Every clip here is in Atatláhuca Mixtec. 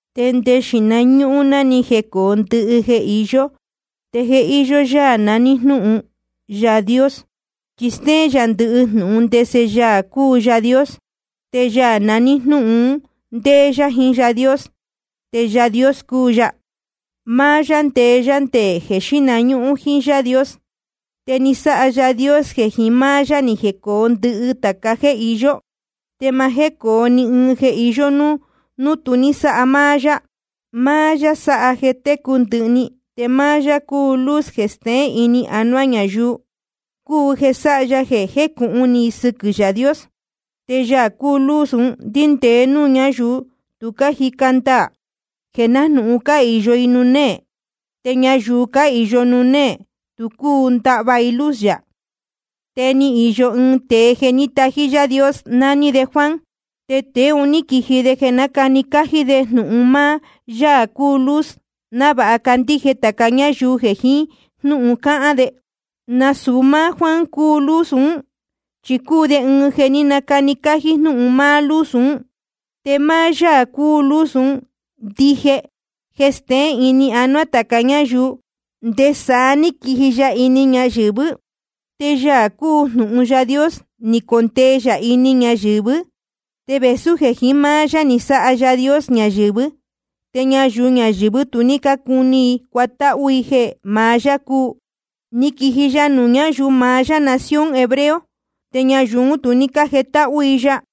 Nde xīhna ñúhún ná ni jecōo ndɨhɨ jeē iyó, te je íyó Yaā naní Jnúhun Yaā Dios, chi stéén yā ndɨhɨ jnūhun ndese Yaā cúu Yaā Dios. Te Yaā naní Jnúhun un ndéé yá jiín Yaā Dios, te Yaā Dios cúu ya. Máá yá ndeé yá nde jeē xíhna ñúhún jíín Yaā Dios. Te ni sáha Yaā Dios jeē jiín máá yá ni jecōo ndɨhɨ tāca jéē iyó. Te ma jécōo ni ɨɨn jeē iyó núu tu ní sáha máá yá. Máá yá sáha jeē técu ndɨhɨ‑ni, te máá yá cúu luz jeē steén ini anuá ñayuu, cúu jeē sáha ya jeē jécūhun ni i sɨquɨ̄ Yaā Dios. Te Yaā cúu luz ún ndíndēe núū ñáyuu tu cájica ndaā, jeē nájnūhun cáhīyo i nuū néē. Te ñayuu cáhīyo nuū néē tu cúu ndahva i luz yā. Te ni īyo ɨɨn tēe jeē ní tají Yaā Dios, naní de Juan. Tēe un ní quiji de jeē nácani cájí de jnūhun máá Yaā cúu luz, návāha candíje tāca ñáyuu jeē jiín jnúhun cáhán de. Nasūu máá Juan cúu luz ún, chi cúu de ɨɨn jeē ní nacani cájí jnúhun máá luz un. Te máá Yaā cúu luz ndije jeē steén ini anuá tāca ñáyuu, nde saá ní quiji ya ini ñayɨ̄vɨ́. Te Yaā cúu Jnūhun Yaā Dios ni condee yā ini ñayɨ̄vɨ́, te vēsú jeē jiín máá yá ni sáha Yaā Dios ñayɨ̄vɨ́, te ñayuu ñayɨ̄vɨ́ tu ní cácuni i cuatáhú i jeē maá yá cúu. Ni quiji ya nuū ñáyuu maá yá nación hebreo, te ñayuu ún tu ní cájetáhú i ya.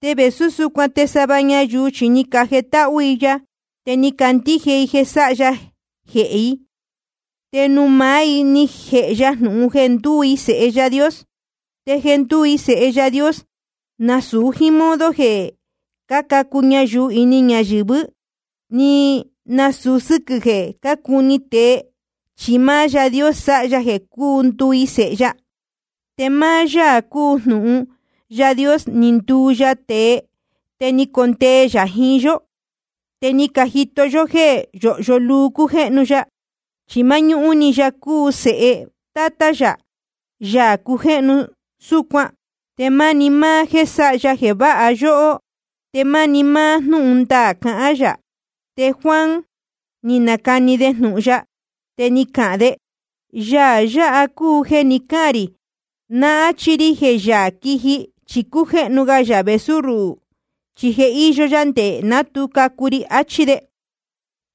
Te vēsú súcuan te sava ñayuu chi ni cajetáhú i ya, te ni cacandíje i jeē sáha ya jehē i. Te nuū maá i ni jēhe ya jnūhun jeē ndúu i sēhe Yaā Dios. Te jeē ndúu i sēhe Yaā Dios, nasūu jíín modo jeē cácacu ñayuu ini ñayɨ̄vɨ́, ni nasūu sɨ́quɨ̄ jeē cácuni tēe, chi máá Yaā Dios sáha ya jeē ndúu i sēhe ya. Te máá Yaā cúu Jnūhun Yaā Dios ni nduu ya tēe, te ni condee yā jiín yó. Te ni cajito yó jéē yóhyo luu cújéhnu ya, chi máñúhún‑ni ya cúu Sēhe Tátá yā, Yaā cujéhnu súcuan. Te máni máá jéē sáha ya jeē váha yóhó, te máni máá jnúhun ndaā cahán yā. Te Juan ni nacani de jnūhun ya, te ni cahān de: Yaā yáha cúu jeē ni cáhān rī náa áchí rí jeē Yaā quiji chi cújéhnu ga yā vēsú ruhū, chi je íyó yá nde ná tu cacu ri, achí de.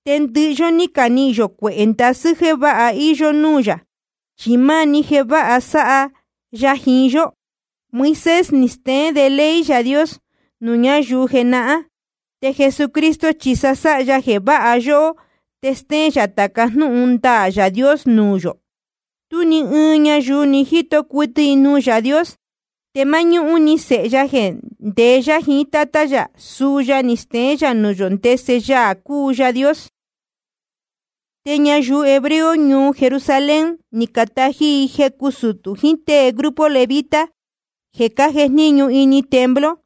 Te ndɨhɨ yó ní canihīn yō cuehē ndasɨ́ jeē váha íyó núū yā, chi máni jeē váha sáha sáha ya jiín yó. Moisés ni steén de ley Yaā Dios nuū ñáyuu jenahán, te Jesucristo chi sáha ya jeē váha yóhó te stéén yā tāca jnúhun ndaā Yaā Dios nuū yō. Tú ni ɨɨn ñayuu ni jíto cuɨtɨ nuū Yaā Dios. Te máñúhún‑ni Sēhe ya jeē ndeé yá jiín Tátá yā, suu ya ni steén nuū yō ndese Yaā cúu Yaā Dios. Te ñayuu hebreo ñuu Jerusalén, ni catají i jecu sutū jiín tée grupo levita jeē cájejníñu ini templo,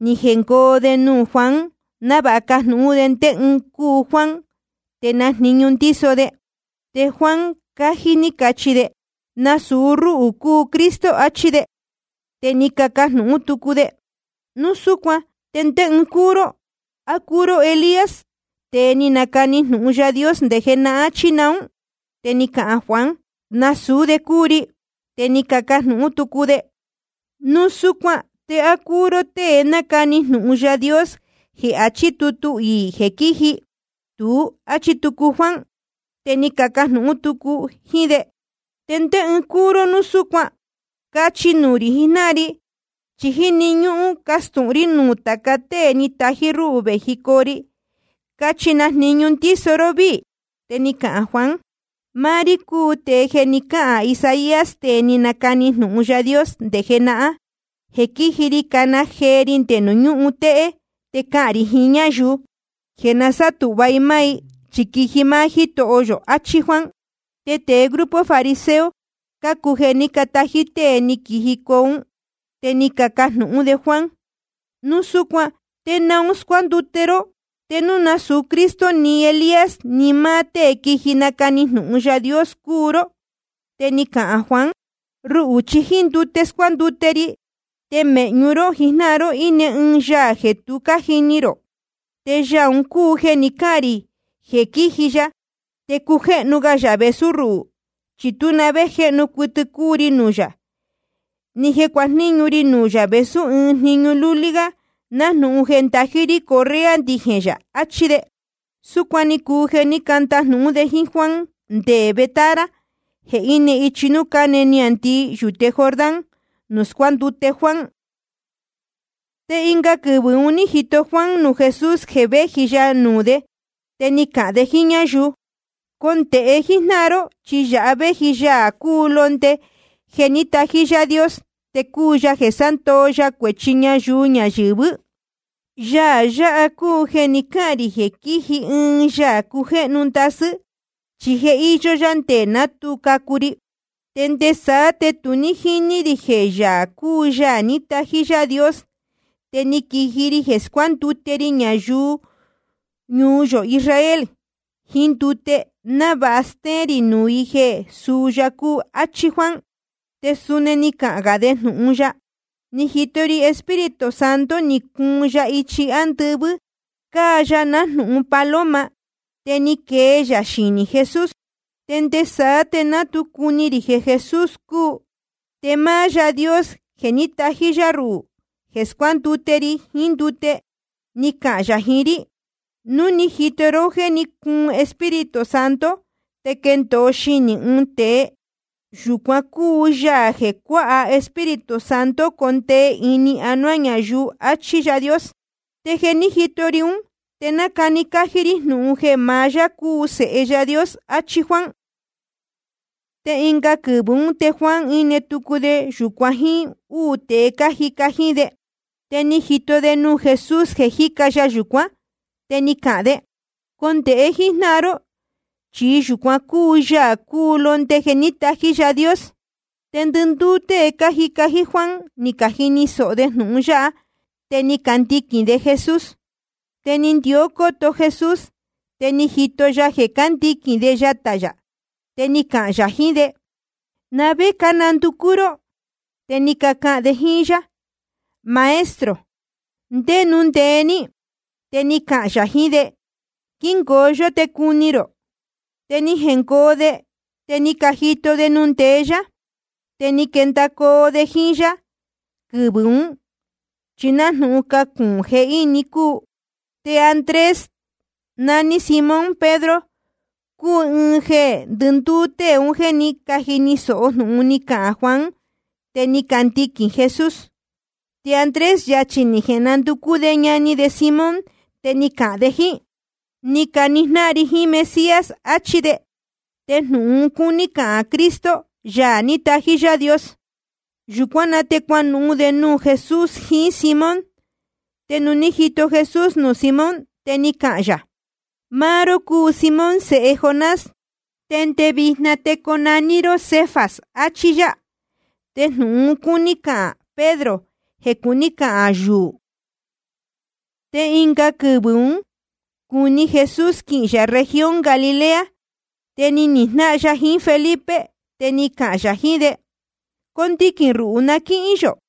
ni jengoo de nuū Juan, návāha cajnūhún de ndé ɨɨn cúu Juan te na jniñu ndíso de. Te Juan cájí ní cachi de: Nasūu rúhū cúu Cristo, achí de. Te ni cacajnūhún tucu de: Núu súcuan ¿te ndé ɨɨn cúu ró? ¿A cúu ró Elías, tēe ni nacani jnūhun Yaā Dios nde jenahán, chí naún? Te ni cahān Juan: Nasūú de cúu ri. Te ni cacajnūhún tucu de: Núu súcuan ¿te á cúu ró tée nacani jnūhun Yaā Dios jeē achí tutu iī jeē quíji? Tuú, áchí tucu Juan. Te ni cacahān tucu jíín de: ¿Te ndé ɨɨn cúu ró núu súcuan? Cachi nuū rī jijnáhan ri, chi jíni ñúhún castūhun rí nuū tāca tée ni catají rúhū vējicoo ri. Cachi na jniñu ndíso ró víī. Te ni cahān Juan: Máá rí cúu tēe jeē ni cáhān Isaías, tēe ni nacani jnūhun Yaā Dios nde jenahán, jeē quíji ri cana jee ri nde nuū ñúhun téhé. Te cáhán rī jiín ñáyuu jeē na sátūhva i máá i, chi quiji máá Jítoho yō. Achí Juan. Te tēe grupo fariseo cácuu jeē ní catají tée ni quijicoo ún. Te ni cacajnūhún de Juan: Núu súcuan ¿te naun scuándute ró te núu nasūu Cristo ni Elías ni máá tée quiji nacani jnūhun Yaā Dios cúu ró? Te ni cahān Juan: Ruhū chi jíín ndute scuándute ri. Te mēhñu ró jijnáhan ró íne ɨɨn Yaā jeē tu cájini rō. Te Yaā un cúu jeē ni cáhān rī jeē quíji ya te cújéhnu ga yā vēsú ruhū. Chi tú na vé jéhnu cuɨtɨ cúu ri nuū yā, ni jeē cuajníñu ri nuū yā vēsú ɨɨn jniñu lúlí gá nájnūhun jeē ndají rí correa ndijēn yā. Achí de. Súcuan ni cuu jeē ní candajnūhún de jíín Juan nde Betábara jeē íne ichi núū cáne niāndii yūte Jordán, nuū scuándute Juan. Te ɨnga quɨvɨ̄ un ní jito Juan nuū Jesús jeē véji ya nuū de. Te ni cahān de jíín ñáyuu: Condēhe jíjnáhan ró, chi yāha véji Yaā cúu Londe jeē ní tají Yaā Dios, te cuu yā jeē sándoo ya cuēchi ñayuu ñayɨ̄vɨ́. Yaā yáha cúu jeē ni cáhān rī jeē quíji ɨɨn Yaā cujéhnu ndasɨ́, chi je íyó yá nde ná tu cacu ri. Te nde saá te tu ní jíní rī jeē yāha cúu Yaā ní tají Yaā Dios. Te ni quiji ri jeē scuándute ri ñayuu ñuu yō Israel jiín ndute, návāha stéén rī nuū i jeē suu ya cúu, áchí Juan. Te suni ni cahān gā de jnūhun ya: Ni jito ri Espíritu Santo, ni cuun ya ichi ándɨvɨ́, cáa ya nájnūhun paloma, te ni quee ya xinī Jesús. Te nde saá te ná tu cuni rī jeē Jesús cúu. Te máá Yaā Dios jeē ní tají yá ruhū jeē scuándute ri jiín ndute, ni cahān yā jiín rí: Núu ni jito ró jéē cúun Espíritu Santo te quendōo xinī ɨɨn tēe, yūcuan cúu Yaā jeē cuáha Espíritu Santo condee ini anuá ñayuu, achí Yaā Dios. Te je ni jito ri ún, te nácani cájí rí jnūhun jeē maá yá cúu Sēhe Yaā Dios. Achí Juan. Te ɨnga quɨvɨ̄ ún te Juan íne tucu de yūcuan jíín úū tēe cájica jíín de. Te ni jito de nuū Jesús jeē jíca ya yūcuán. Te ni cahān de: Condēhe jíjnáhan ró, chi yūcuan cúu Yaā cúu Londe jeē ní tají Yaā Dios. Te ndɨndúú tée cájica jíín Juan ni cajini sōho de jnūhun yáha, te ni candiquīn de Jesús. Te ni ndió cóto Jesús, te ni jito ya jeē cándiquīn de yatā yā. Te ni cahān yā jiín de: ¿Na vé cánanducú ró? Te ni cacahān de jíín yá: Maestro, ¿ndé nuū ndeé ní? Te ni cahān yā jiín de: Quíngoo yó te cuni rō. Te ni jengoo de, te ni cajito de nuū ndeé yá. Te ni caquendōo de jíín yá quɨvɨ̄ ún, chi nájnūhun cacuūn jehíni cúu. Te Andrés, ñani Simón Pedro, cúu ɨɨn jeē ndɨndúú tée un jéē ní cajini sōho jnūhun ni cahān Juan, te ni candiquīn Jesús. Te Andrés, yachī ni jenanducú de ñani de Simón, te ni cahān de jíín: Ni caquijnáhan ri jiín Mesías, achí de. Te jnūhun un cúní cahān Cristo, Yaā ní tají Yaā Dios. Yūcuán na te cuanuhun de nuū Jesús jiín Simón. Te nuū ní jito Jesús nuū Simón, te ni cahān yā: Máá ró cúu Simón sēhe Jonás. Te nde vijna te conaní ró Cefas, achí yá. Te jnūhun un cúní cahān Pedro, jeē cuní cahān yuū. Te ɨnga quɨvɨ̄ un cúní Jesús quihīn yā región Galilea. Te ni nihīn jnáhan ya jiín Felipe, te ni cahān yā jiín de: Condiquīn ruhū na quíhín yō.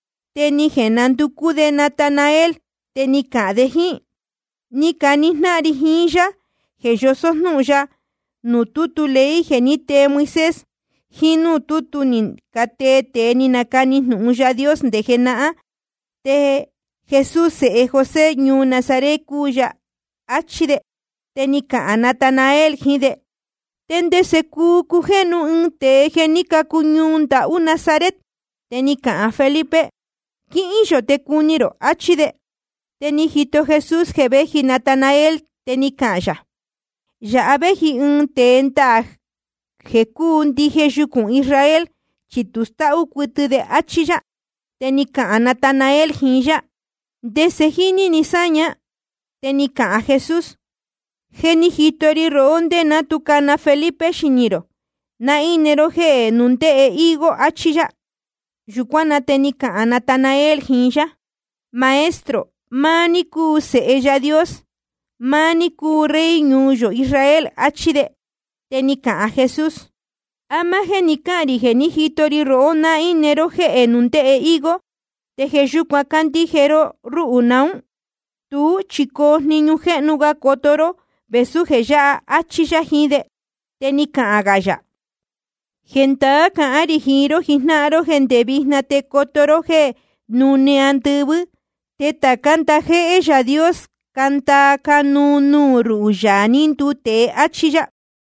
Te ni jenanducú de Natanael, te ni cahān de jíín: Ni canihīn jnáhan ri jiín Yaā jeē yosó jnúhun ya nuū tútu ley jeē ní tee Moisés, jiín núū tútu ni catee tēe ni canacani jnūhun Yaā Dios nde jenahán. Te Jesús sēhe José ñuu Nazaret cúu ya. Achí de. Te ni cahān Natanael jiín de: ¿Te ndese cúu cujéhnu ɨɨn tēe jeē ní cacu ñuu ndahú Nazaret? Te ni cahān Felipe: Quíhín yō de cuni rō, achí de. Te ni jito Jesús jeē véji Natanael, te ni cahān yā: Yāha véji ɨɨn tēe ndaā jeē cúu ndije yucūn Israel, chi tu stáhú cuɨtɨ de, áchí yá. Te ni cahān Natanael jiín yá: ¿Ndese jíní ni sáña? Te ni cahān Jesús: Je ni jito ri rohó ndé ná tu cana Felipe xinī rō, ná íne ró jéhē nundéhe higo, achí yá. Yūcuán na te ni cahān Natanael jiín yá: Maestro, máá ní cúu Sēhe Yaā Dios, máá ní cúu Rey ñuu yō Israel, achí de. Te ni cahān Jesús: ¿A máá jéē ni cáhān rī jeē ní jito ri rohó ná íne ró jéhē nundéhe higo, te jeē yúcuan cándíje ró rúhū naún? Tuú chi coo jniñu jéhnu ga coto ró vēsú jeē yáha, áchí yá jiín de. Te ni cahān gā yā: Jendaá cahán rī jiín ró jijnáhan ró jéē nde vijna te coto ró jéē núne andɨvɨ́, te tācá ndajéhé Yaā Dios cándaa cánuu nuū ruhū, Yaā ní nduu tēe, áchí yá.